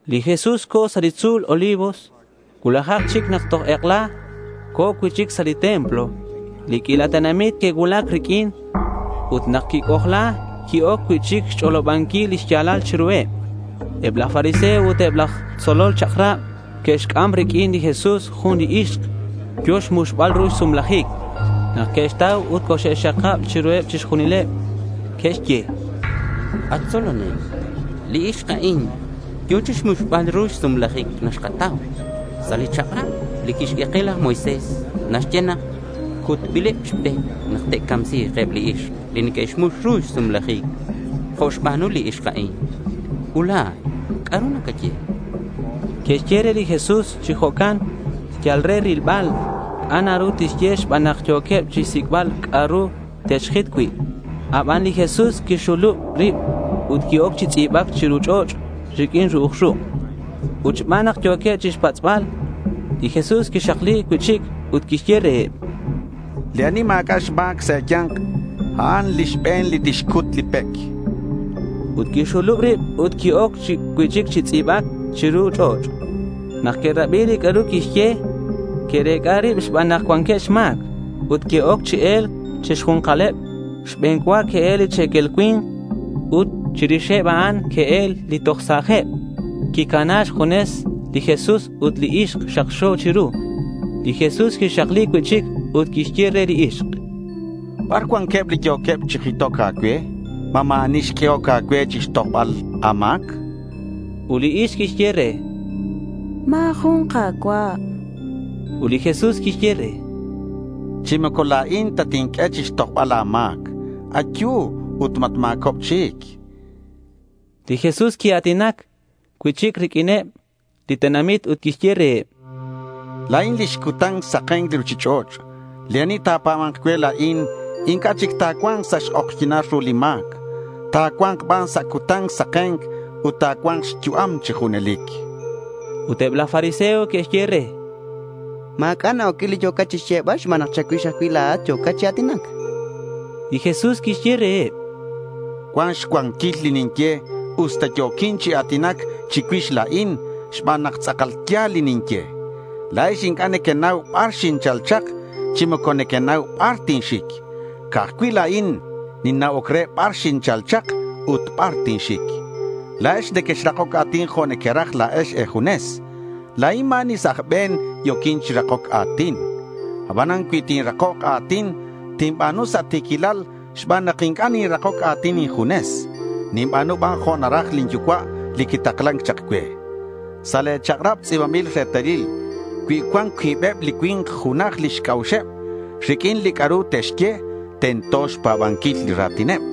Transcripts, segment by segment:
Li Jesús co̱ sa' li tzu̱l Olivos. Cuulajak chic nak toj ek'ela co̱ cui'chic sa' li templo. Li q'uila tenamit que'cuulac riq'uin. Ut nak quic'ojla, qui-oc cui'chic chixch'olobanquil li xya̱lal chiruheb. Eb laj fariseo ut eb laj tzolol chak'rab que'xc'am riq'uin li Jesús jun li ixk yo̱ chixmuxbal ru xsumlajic nak que'xtau ut coxxe'xxakab chiruheb chixjunileb. Que'xye: —At tzolonel, li ixk a'in yo̱ chixmuxbal ru xsumlajic nak xkatau. Sa' li chak'rab li quixq'ue ke laj Moisés naxye nak cutbileb chi pec nak te'camsi̱k eb li ixk li neque'xmux ru lix sumlajic jo' xba̱nu li ixk a'in. Ut la̱at, ¿c'a'ru nacaye? chanqueb. Que'xye re li Jesús chi jo'can yal re rilbal c'a' na ru tixye xban nak yo̱queb chixsic'bal c'a'ru te'xjit cui'. Aban li Jesús quixxulub rib ut qui-oc chi tz'i̱bac chiru ch'och' riq'uin ru'uj ruk'. Ut xban nak yo̱queb chixpatz'bal, li Jesús quixakli cui'chic ut quixye reheb: —Li ani ma̱c'a' xma̱c sa' e̱ya̱nk, a'an li xbe̱n li tixcut li pec, chan. Ut quixxulub rib ut qui-oc cui'chic chi tz'i̱bac chiru ch'och'. Nak que'rabi li c'a'ru quixye, que'rec'a rib xban nak cuanqueb xma̱c ut que'oc chi e̱lc chi xju̱nkaleb. Xbe̱n cua que'el li che̱quel cui̱nk ut chirixeb a'an que'el li toj sa̱jeb. Quicana xjunes li Jesús ut li ixk xakxo chiru. Li Jesús quixakli cui'chic ut quixye re li ixk: —¿Bar cuanqueb li yo̱queb chi jitoc a̱cue? ¿Ma ma̱ ani xq'uehoc a̱cue chixtojbal a̱ma̱c? chan. Ut li ixk quixye re: —Ma̱ jun, Ka̱cua'.— Ut li Jesús quixye re: —Chi moco la̱in tatinq'ue chixtojbal a̱ma̱c. Ayu ut matma̱cob chic, chan. Li Jesús quia̱tinac cui'chic riq'uineb li tenamit ut quixye reheb: —La̱in lix cutan saken li ruchich'och'. Li ani ta̱pa̱ba̱nk cue la̱in, inc'a' chic ta̱cua̱nk sa' xk'ojyi̱nal ru li ma̱c. Ta̱cua̱nk ban sa' cutan saken ut ta̱cua̱nk xyu'am chi junelic, chan. Ut eb laj fariseo que'xye re: —Ma̱c'a' na-oc cui' li c'a'ru yo̱cat chixyebal xban nak cha̱cuix ajcui' la̱at yo̱cat chi a̱tinac, chanqueb. Li Jesús quixye reheb: —Cuan xcuanquil li ninye usta yo̱quin chi a̱tinac chicuix la̱in xban nak tz'akal ya̱l li ninye. La̱ex inc'a' nequenau bar xinchal chak, chi moco nequenau bar tinxic. Ca'aj cui' la̱in ninna'oc re bar xinchal chak ut bar tinxic. La̱ex nequexrakoc a̱tin jo' nequeraj la̱ex e̱junes. La̱in ma̱ ani sa' aj be̱n yo̱quin chi rakoc a̱tin. Abanan cui tinrakok a̱tin, tinba̱nu sa' ti̱quilal xban nak inc'a' ninrakoc a̱tin injunes. Ninba̱nu ban jo' naraj lin Yucua' li quitaklan chak cue. Sa' le̱ chak'rab tz'i̱banbil retalil cui cuan cuibeb li cui̱nk junaj lix c'a'uxeb riq'uin li c'a'ru te'xye, tento xpa̱banquil li ra̱tineb.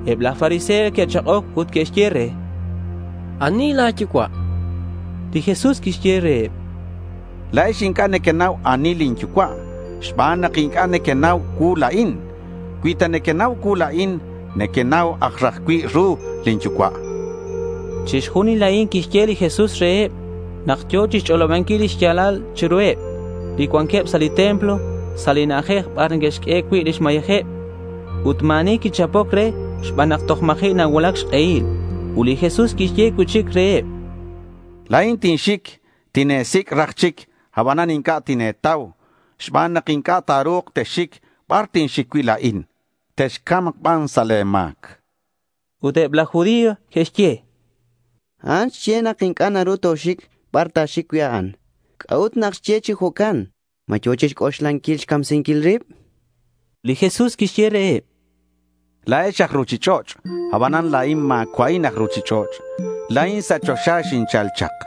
Eb laj fariseo que'chak'oc ut que'xye re: —¿Ani la̱ yucua'? chanqueb re. Li Jesús quixye reheb: —La̱ex inc'a' nequenau ani lin Yucua' xban nak inc'a' nequenau cuu la̱in. Cui ta nequenau cuu la̱in, nequenau aj raj cui' ru lin Yucua', chan reheb. Chixjunil a'in quixye li Jesús reheb nak yo̱ chixch'olobanquil li xya̱lal chiruheb li cuanqueb sa' li templo sa' li na'ajej bar neque'xq'ue cui' lix mayejeb. Ut ma̱ ani quichapoc re xban nak toj ma̱ji' nacuulac xk'ehil. Ut li Jesús quixye cui'chic reheb: —La̱in tinxic. Tine̱sic' raj chic abanan inc'a' tine̱tau xban nak inc'a' ta̱ru̱k texxic bar tinxic cui' la̱in. Texca̱mk ban sa' le̱ ma̱c, chan. Ut eb laj judío que'xye: —A'an xye nak inc'a' naru toxic bar ta̱xic cui' a'an. ¿C'a'ut nak xye ke chi jo'can? ¿Ma yo̱ chixc'oxlanquil xcamsinquil rib? chanqueb. Li Jesús quixye reheb: —La̱ex aj ruchich'och'. Abanan la̱in ma̱cua'in aj ruchich'och'. La̱in sa' choxa xinchal chak.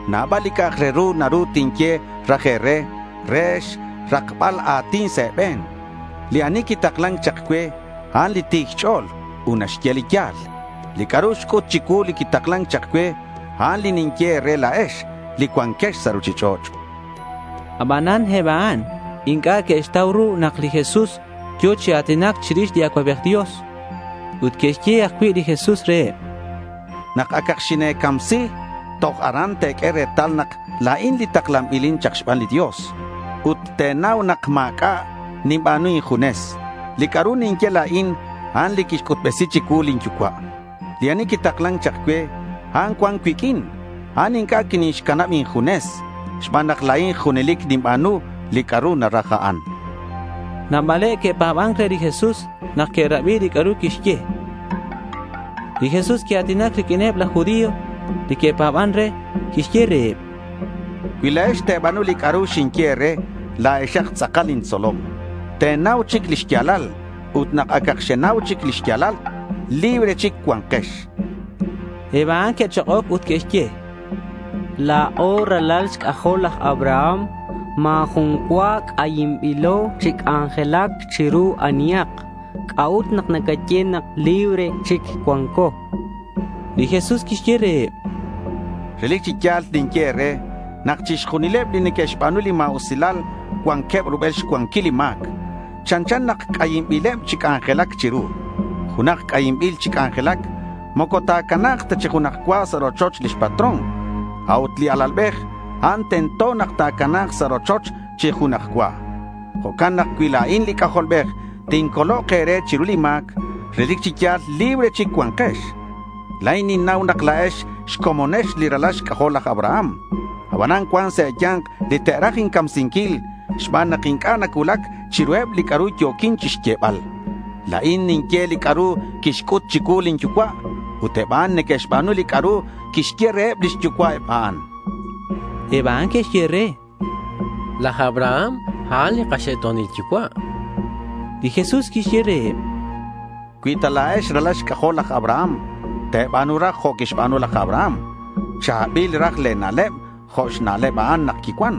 Nabal li c'a'ak re ru naru tinye raj e̱re re xrakbal a̱tin sa' e̱be̱n. Li ani quitaklan chak cue, a'an ti̱c xch'o̱l ut naxye li ya̱l. Li c'a'ru xc'ut chicuu li quitaklan chak cue, a'an li ninye e̱re la̱ex li cuanquex sa' ruchich'och', chan. Abanan eb a'an inc'a' que'xtau ru nak li Jesús yo̱ chi a̱tinac chirix li Acuabej Dios. Ut quixye ajcui' li Jesús reheb: —Nak acak xine̱taksi chiru li cruz re incamsinquil toj aran te̱q'ue retal nak la̱in li taklanbilin chak xban li Dios. Ut te̱nau nak ma̱c'a' ninba̱nu injunes. Li c'a'ru ninye la̱in, a'an li quixc'utbesi chicuu lin Yucua'. Li ani quitaklan chak cue, a'an cuan cuiq'uin. A'an inc'a' quinixcanab injunes xban nak la̱in junelic ninba̱nu li c'a'ru naraj a'an, chan li Jesús. Nabaleb que'pa̱ban re li Jesús nak que'rabi li c'a'ru quixye. Li Jesús quia̱tinac riq'uineb laj judío li que'pa̱ban re. Quixye reheb: —Cui la̱ex te̱ba̱nu li c'a'ru ninye e̱re, la̱exak tz'akal intzolom. Te̱nau chic li xya̱lal. Ut nak acak xenau chic li xya̱lal, libre chic cua̱nkex, chan. Eb a'an que'chak'oc ut que'xye: —La̱o ralal xc'ajol laj Abraham. Ma̱ jun cua c'ayinbilo chi c'anjelac chiru anihak. ¿C'a'ut nak nacaye nak libre chic cua̱nko? Li Jesús quixye reheb: —Relic chi ya̱l ninye e̱re nak chixjunileb li neque'xba̱nu li ma̱usilal cuanqueb rubel xcuanquil li ma̱c. Chanchan nak c'ayinbileb chi c'anjelac chiru. Junak c'ayinbil chi c'anjelac moco ta̱cana̱k ta chi junaj cua sa' rochoch lix patrón. A'ut li alalbej, a'an tento nak ta̱cana̱k sa' rochoch chi junaj cua. Jo'can nak cui la̱in li C'ajolbej tincolok e̱re chiru li ma̱c, relic chi ya̱l libre chic cua̱nkex. La̱in ninnau nak la̱ex xcomonex li ralal xc'ajol laj Abraham. Abanan cuan sa' e̱ya̱nk li te'raj incamsinquil xban nak inc'a' nacuulac chiruheb li c'a'ru yo̱quin chixyebal. La̱in ninye li c'a'ru quixc'ut chicuu lin Yucua'. Ut eb a'an neque'xba̱nu li c'a'ru quixye reheb lix yucua'eb a'an, chan. Eb a'an que'xye re: —Laj Abraham, a'an li kaxe'to̱nil yucua', chanqueb. Li Jesús quixye reheb: —Cui ta la̱ex ralal xc'ajol laj Abraham, te̱ba̱nu raj jo' quixba̱nu laj Abraham. Cha̱bil raj le̱ na'leb jo' xna'leb a'an nak quicuan.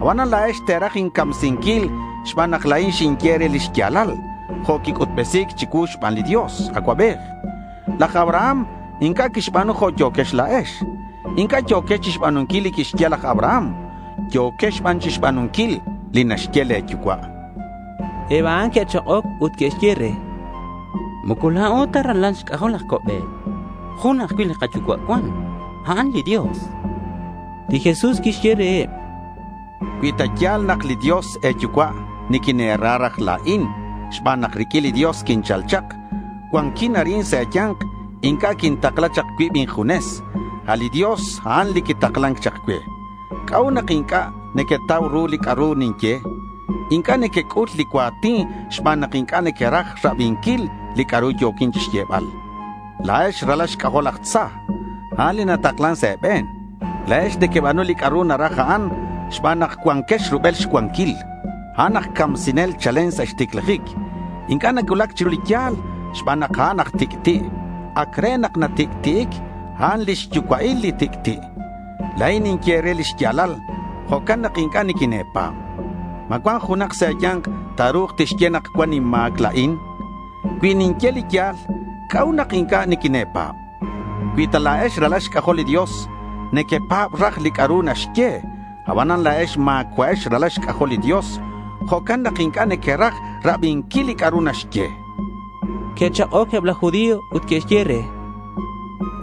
Abanan la̱ex te̱raj incamsinquil xban nak la̱in xinye e̱re li xya̱lal jo' quic'utbesi̱c chicuu xban li Dios Acuabej. Laj Abraham inc'a' quixba̱nu jo' yo̱quex la̱ex. Inc'a' yo̱quex chixba̱nunquil li quixye laj Abraham. Yo̱quex ban chixba̱nunquil li naxye le̱ yucua', chan li Jesús. Eb a'an que'chak'oc ut que'xye re: —Moco la̱o ta ralal xc'ajol laj co'be̱t. Jun ajcui' li kayucua' cuan. A'an li Dios, chanqueb. Li Jesús quixye reheb: —Cui ta ya̱l nak li Dios e̱yucua', niquine̱ra raj la̱in xban nak riq'uin li Dios quinchal chak. Cuanquin arin sa' e̱ya̱nk. Inc'a' quintakla chak cuib injunes. A' li Dios, a'an li quitaklan chak cue. ¿C'a'ut nak inc'a' nequetau ru li c'a'ru ninye? Inc'a' nequec'ul li cua̱tin xban nak inc'a' nequeraj rabinquil li c'a'ru yo̱quin chixyebal. La̱ex ralal xc'ajol laj tza. A'an li nataklan sa' e̱be̱n. La̱ex nequeba̱nu li c'a'ru naraj a'an xban nak cuanquex rubel xcuanquil. A'an aj camsinel chalen sa' xticlajic. Inc'a' nacuulac chiru li ya̱l xban nak a'an aj tic'ti'. Ac re nak natic'ti'ic. A'an li xyucua'il li tic'ti'. La̱in ninye e̱re li xya̱lal. Jo'can nak inc'a' niquine̱pa̱b. ¿Ma cuan junak sa' e̱ya̱nk ta̱ru̱k tixye nak cuan inma̱c la̱in? Cui ninye li ya̱l, ¿c'a'ut nak inc'a' niquine̱pa̱b? Cui ta la̱ex ralal xc'ajol li Dios, nequepa̱b raj li c'a'ru naxye. Abanan la̱ex ma̱cua'ex ralal xc'ajol li Dios. Jo'can nak inc'a' nequeraj rabinquil li c'a'ru naxye, chan li Jesús. Que'chak'oc eb laj judío ut que'xye re: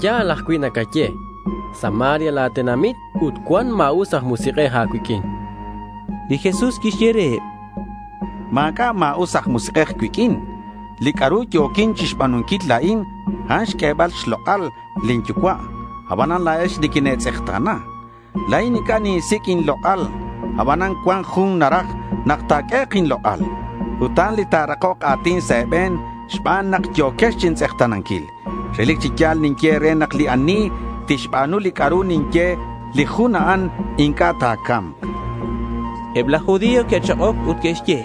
—Ya̱l ajcui' nacaye. Samaria la̱ tenamit ut cuan ma̱us aj musik'ej a̱cuiq'uin, chanqueb. Li Jesús quixye reheb: —Ma̱c'a' ma̱us aj musik'ej cuiq'uin. Li c'a'ru yo̱quin chixba̱nunquil la̱in, a'an xq'uebal xlok'al lin Yucua'. Abanan la̱ex niquine̱tz'ekta̱na. La̱in inc'a' ninsic' inlok'al. Abanan cuan jun naraj nak ta̱q'uehek' inlok'al. Ut a'an li ta̱rakok a̱tin sa' e̱be̱n xban nak yo̱quex chintz'ekta̱nanquil. Relic chi ya̱l ninye e̱re nak li ani tixba̱nu li c'a'ru ninye, li jun a'an inc'a' ta̱ca̱mk, chan. Eb laj judío que'chak'oc ut que'xye: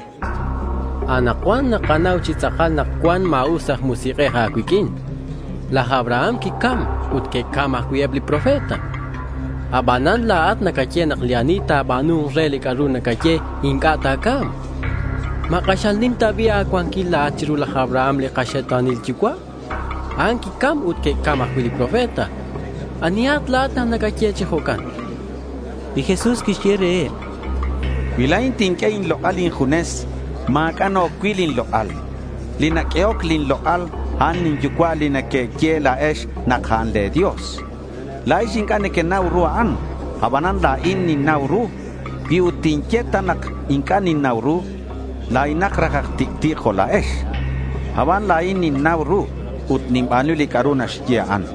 —Anakcuan nakanau chi tz'akal nak cuan ma̱us aj musik'ej a̱cuiq'uin. Laj Abraham quicam ut que'cam ajcui' eb li profeta. Abanan la̱at nacaye nak li ani ta̱ba̱nu̱nk re li c'a'ru nacaye inc'a' ta̱ca̱mk. ¿Ma k'axal nim ta bi' a̱cuanquil la̱at chiru laj Abraham li kaxe'to̱nil yucua'? A'an quicam ut que'cam ajcui' li profeta. ¿Anihat la̱at nak nacaye chi jo'can? chanqueb re. Li Jesús quixye reheb: —Cui la̱in tinq'ue inlok'al injunes, ma̱c'a' na-oc cui' lin lok'al. Li naq'uehoc lin lok'al, a'an lin Yucua' li nequeye la̱ex nak a'an le̱ Dios. La̱ex inc'a' nequenau ru a'an. Abanan la̱in ninnau ru. Cui ut tinye ta nak inc'a' ninnau ru, la̱inak raj aj tic'ti' jo' la̱ex. Aban la̱in ninnau ru ut ninba̱nu li c'a'ru naxye a'an.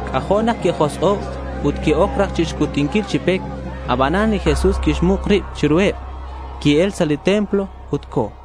C'ajo' nak que'josk'o' ut que'oc raj chixcutinquil chi pec. Abanan li Jesús quixmuk rib chiruheb. Qui-el sa' li templo ut co̱.